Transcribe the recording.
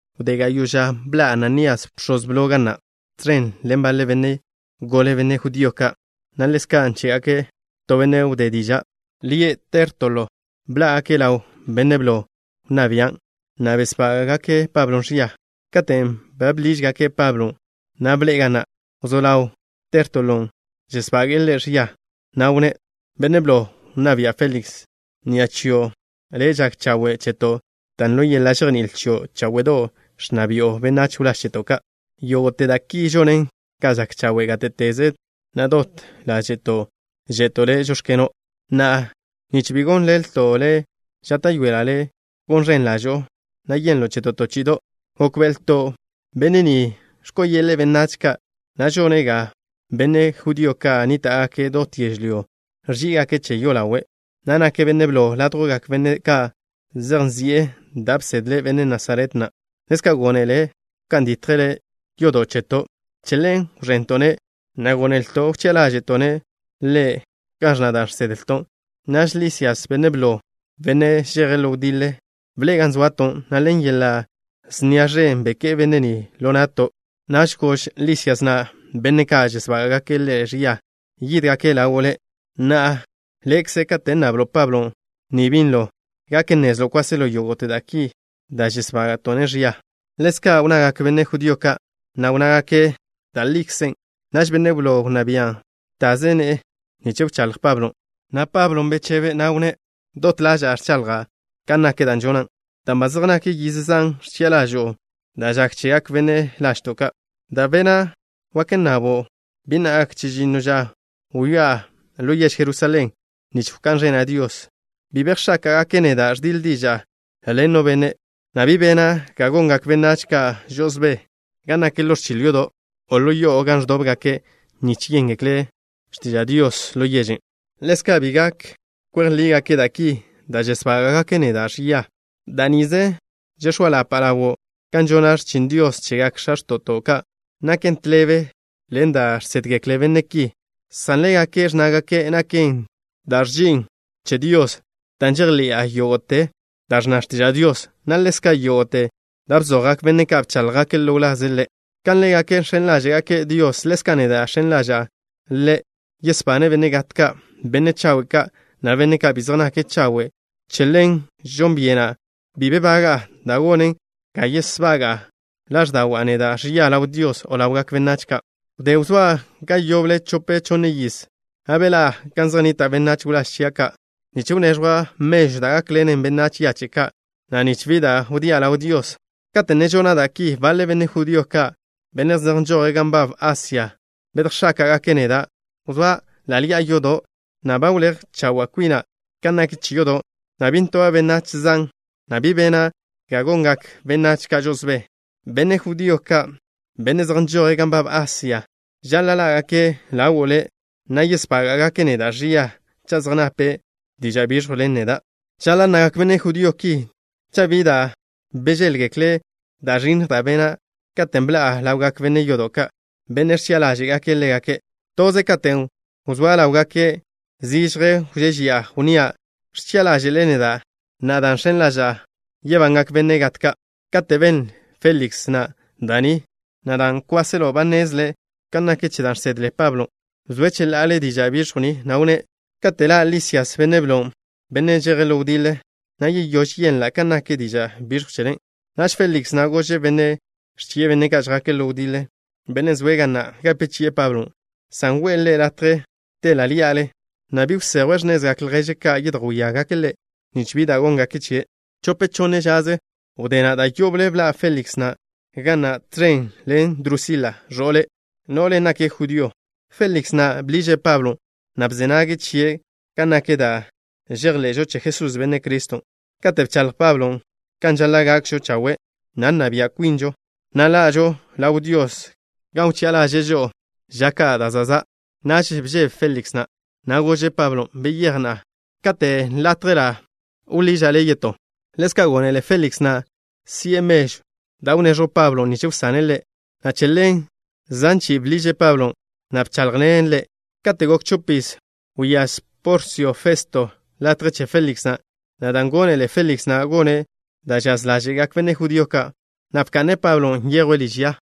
Wdé gayo' ža, bḻa' Ananías, bx̱oz blo, ga na', tẕen ḻen baḻe benne' gole, benne' judío ka', na' ḻezka' ḻen Tértolo, to benne' žákḻi'e diža'. Bḻá'gake' ḻaw benne' blo wnná bian', na' besbága'gake' Pablo ẕia. Katen' ba bḻížgake' Pablon', na' bḻe'e ga na', wzó ḻaw Tértolon' žesbage'e ḻe' ẕia, na' wnné': —Benne' blo wnná bia', Féliks. Ni'a chio' le' žak chawe' cheto', dan' ḻo yeḻa' žejní'il chio' cháwe'do' ẕnna bi'o benách wláž cheto' ka'. Yógo'te da' ki žonen ga žak chawe' gáte'teze, na' dot ḻáže'to' že'to' le': “Žóx̱keno'.” Na'a, nich bi gon ḻelto' le', žáta'yoela' le' gon ẕen ḻažo'o, na' yenlo' cheto' to chi'ido'. Gókbe'elto' benne' ni ẕko'o yeḻe'e benách ka', na' žone' ga benne' judío ka' nníta'gake' dot yežlyó ẕží'igake' che yolawe', na' nake' benne' blo ládjwgak benne' ka' zej nzi'e da' bsedle benne' Nasaret na'. Ḻezka' gónele' wká'n ditje' yodo' cheto'. Che ḻen wẕento'-ne', na' gónelto' wchi'a ḻáže'to' ḻe' kan ẕnna da' žsedlto'. Naž Lisias, benne' blo, benne' žeje' ḻo wdiḻe, bḻe'e gan zoato', na' ḻen yeḻa' snia ẕen beké'e benne' ni ḻo na'to'. Naž gož Lisias na' benne' ka' žesbága'gake' ḻe' ẕia, yídgake' ḻawo' le'. Na'a, le'kzo', kate' nnablo' Pablo ni binlo, gak nnezlo' kwáselo yógo'te da' ki da' žesbága'to'-ne' ẕia. Ḻezka' wnnagak benne' judío ka', na' wnnágake' da' likzen'. Naž benne' blo wnná bian' btaze ne'e nich wcháḻj Pablon', na' ḻe' bechebe', na' wnné': —Dot ḻaža'a ẕchaḻja' kan nak da' žona', dan' ba zej nak yiz zan ẕchi'a ḻažo'o da' žak chegak benách lažto' ka'. Da' bena' wak nnabo'. Bi na' gak chežinno ža wyá'a ḻo yež Jerusalén nich wká'n ẕena' Dios. Bi bejx̱áka'gake' neda' ẕdiḻ diža'a ḻen no benne', na' bi bena' ga gongak benách ka' žo'osbé gan nak ḻo ẕchil yodo', o ḻo yo'o gan ẕdóbgake' nich yéngekle' x̱tiža' Dios, o ḻo yež. Ḻezka' bi gak kwej lígake' da' ki da' žesbága'gake' neda' ẕia. Da' nize žex̱óalapa' ḻawo'. Kan žona' x̱chin Dios chegak x̱a x̱to'to' ka' naken tḻebe ḻen da' žsédgekle benne' ki, san ḻégake' ẕnnágake' naken da' ẕži'in che Dios, dan' žejḻi'a yógo'te da' ẕnna x̱tiža' Dios, na' ḻezka' yógo'te da' bzojgak benne' ka' bcháḻjgake' ḻo wlaze' Ḻe'. Kan ḻégake' žx̱en ḻáže'gake' Dios, ḻezka' neda' žx̱en ḻaža'a Ḻe', yesbane' benne' gat ka', benne' chawe' ka', na' benne' ka' bi zej nake' chawe'. Che ḻen žon byena' bi baga'a da' gonen ga yesbaga' ḻáẕda'wa' neda' ẕia ḻaw Dios o ḻawgak benách ka'. ’Wdé wzóa' ga yoble chope chonne yiz, na' beḻá'a gan zej nnita' benách wláž chia' ka' nich wneẕjwa' mežw da' gákḻenen benách yache' ka', na' nich bi da' wdía' ḻaw Dios. Kate' ne žona' da' ki, baḻe benne' judío ka', benne' zej nžoje' gan nbab Asia bedjx̱áka'gake' neda'. Wzóa' ḻa' ḻi'a yodo', na' ba wléj chawe' kwina' kan nak che yodo', na' bi ntoba' benách zan, na' bi bena' ga gongak benách ka' žo'osbé. Benne' judío ka', benne' zej nžoje' gan nbab Asia, žaḻa' ḻá'gake' ḻawo' le', na' yesbága'gake' neda' ẕia cha' zej nape' diža' biẕjw ḻen neda'. Žaḻa' nnagak benne' judío ki cha' bi da' bžéḻgekle' da' ẕinnj da' bena' katen' bḻa'a ḻawgak benne' yodo' ka', benne' ẕchi'a ḻáže'gake' ḻégake'. Toze katen' wzóa' ḻáwgake', zižje wžežia', wnnía': “Ẕchi'a ḻáže'le neda' na'a dan' žx̱en ḻaža'a yebangak benne' gat ka'.” Kate' benle Féliks na' da' ni, na' dan' kwáselo ba nnezle' kan nak che da' žsedle Pablon', bzoe' cheḻa'ale diža' biẕjw ni, na' wnné': —Kate' ḻa' Lisias, benne' blon', benne' žeje' ḻo wdiḻe, na' yeyóž yenla' kan nak diža' biẕjw chele. Naž Féliks na' gože' benne' ẕchi'e benne' ka' žjake' ḻo wdiḻe, benne' zoe' ga na', gape chi'e Pablon', san we'e ḻe' latje te' ḻa' ḻí'ale, na' bi wsejwe' x̱nezgak lježe' ka' yedjwíagake' ḻe', nich bi da' góngake' chie'. Chope chonne žaze wdé na', da' yoble bḻa' Féliks na' ga na' tẕen ḻen Drusila, ẕo'le'. No'len' nake' judío. Féliks na' bḻiže' Pablon', na' bze nage' chie' kan nak da' žejḻe'žo che Jesús, Benne' Criston'. Kate' bchaḻj Pablon' kan žaḻa' gakžo chawe', na' nna bia' kwinžo, na' ḻa'žo ḻaw Dios gan wchi'a ḻaže'e žo'o ža da' za' za', naž bžebe Féliks na', na' gože' Pablon': —Beyéj na'a. Kate' gapa' latje, wḻiža' le' yetó. Ḻezka' gónele Féliks na' si'e mežw da' wneẕjw Pablon' nich wsane' ḻe', na' che ḻen, zan chi'i bḻiže' Pablon', na' bcháḻjḻene' ḻe'. Kate' gok chopiz, wyáz Porsio Festo latje che Féliks na', na' dan' gónele Féliks na' gone' da' žaz ḻáže'gak benne' judío ka', na' bka'ne' Pablon' nyejwe' liž ya.